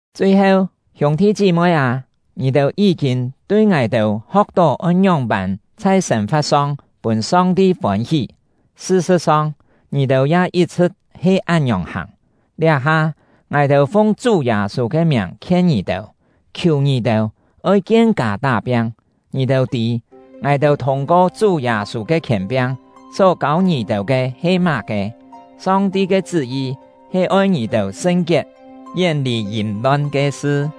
Chui-heu, hiûng-thi chí-moi â, ngì-têu yí-kîn tui ngài-têu ho̍k-tó oi ngióng-pân chhai sên-fa̍t-song pûn Song-ti fôn-hí; sṳ-sṳ̍t-song, ngì-têu ya yit-chhṳ̍t he án-ngiòng hàng. Liá-ha, ngài-têu fung Chú Yâ-sû ke miàng khien ngì-têu, khiù ngì-têu, oi kien-kâ tá-piang. Ngì-têu tî, ngài-têu thûng-ko Chú Yâ-sû ke khièn-piang só kâu ngì-têu ke he má-ke. Song-ti ke chṳ́-yi he oi ngì-têu sṳn-kiet, yén-lì yìm-lon ke sṳ;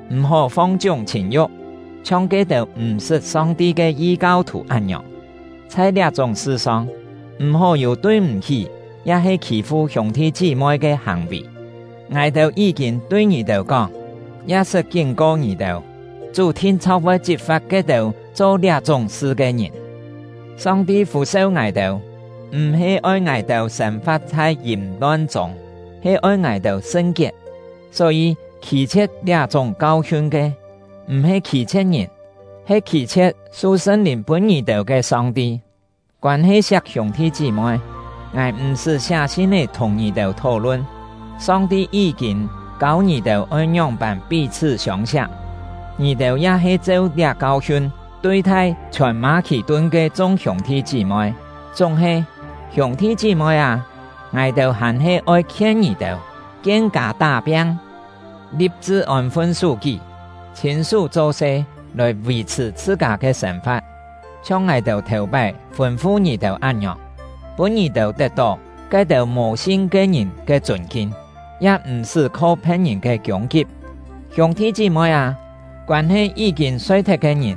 m̀-hó fong-chiúng chhìn-yu̍k, chhiong ke-têu m̀ sṳt Song-ti ke yi-kau-thù án-ngiòng. Chhai liá-chúng sṳ-song, m̀-hó yû tui-m̀-hí ya-he khî-fu hiûng-thi chí-moi ke hàng-vì. Ngài-têu yí-kîn tui ngì-têu kóng, ya sṳt kín-ko ngì-têu: Chú thin-chho̍k voi chit-fa̍t ke-têu cho liá-chúng sṳ ke ngìn. Song-ti fû-seu ngài-têu, m̀-he oi ngài-têu sên-fa̍t chhai yìm-lon chûng, he oi ngài-têu sṳn-kiet. Só-yî, khî-chhie̍t liá-chúng kau-hiun ke, m̀-he khî-chhie̍t ngìn, he khî-chhie̍t su Sṳn-Lìn pûn ngì-têu ke Song-ti. Koân-he siak hiûng-thi chí-moi, ngài m̀-sṳ́ siá sin-é thùng ngì-têu thó-lun; Song-ti yí-kîn kâu ngì-têu oi ngióng-pân pí-chhṳ́ siông-siak, ngì-têu ya he cheu liá kau-hiun tui-thai chhiòn Mâ-khì-tun ke chung hiûng-thi chí-moi. Chúng-he, hiûng-thi chí-moi â, ngài-têu hàn-he oi khien ngì-têu: Kien-kâ tá-piang, li̍p-chṳ ôn-fun sú-kí, chhîn-sú cho-se lòi vì-chhṳ̀ chhṳ-kâ ke sên-fa̍t, chhiong ngài-têu thèu-pái fûn-fu ngì-têu án-ngiòng, pûn ngì-têu tet-tó ke-têu mò-sin ke ngìn ke chûn-kin, ya m̀-sṳ́ kho phe̍t-ngìn ke kiûng-kip. Hiûng-thi chí-moi â, koân-he yí-kîn soi-thet ke ngìn,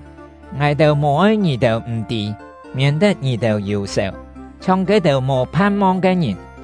ngài-têu mò-oi ngì-têu m̀ tî, miên-tet ngì-têu yù-sèu, chhiong ke-têu mò phan-mong ke ngìn.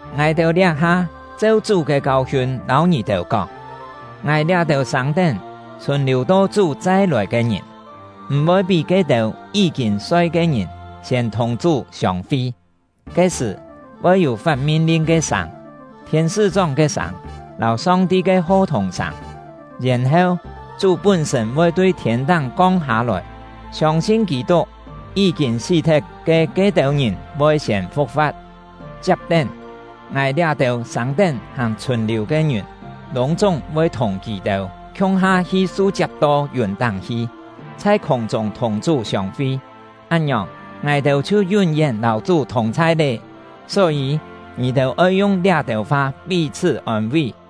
Ngài-têu liá-ha cheu Chú ke kau-hiun lâu ngì-têu kóng: Ngài liá-têu sâng-tén, chhùn-liù to Chú chai-lòi ke ngìn, m̀-voi pí ke-têu yí-kîn soi ke ngìn siên thùng Chú siông-fi. Ke-sṳ̀, voi yû fat min-lin ke sâng, thiên-sṳ́-chóng ke sâng, lâu Song-ti ke ho-thùng sâng, yèn-heu, Chú pún-sṳ̂n voi tui thiên-táng kong hâ-lòi. Siông-sin Kî-tuk, yí-kîn sí-thet ke ke-têu ngìn voi siên fu̍k-fa̍t; chiap-tén, ngài liá-têu sâng-tén hàn chhùn-liù ke ngìn lûng-chúng voi thùng kì-têu khiung-ha su-chiap to yùn-táng hi, chhai khûng-chûng thùng Chú siông-fi. Án-ngiòng, ngài-têu chhiu yún-yén lâu Chú thùng-chhai lé. Só-yî, ngì-têu oi yung liá-têu fa pí-chhṳ́ ôn-ví.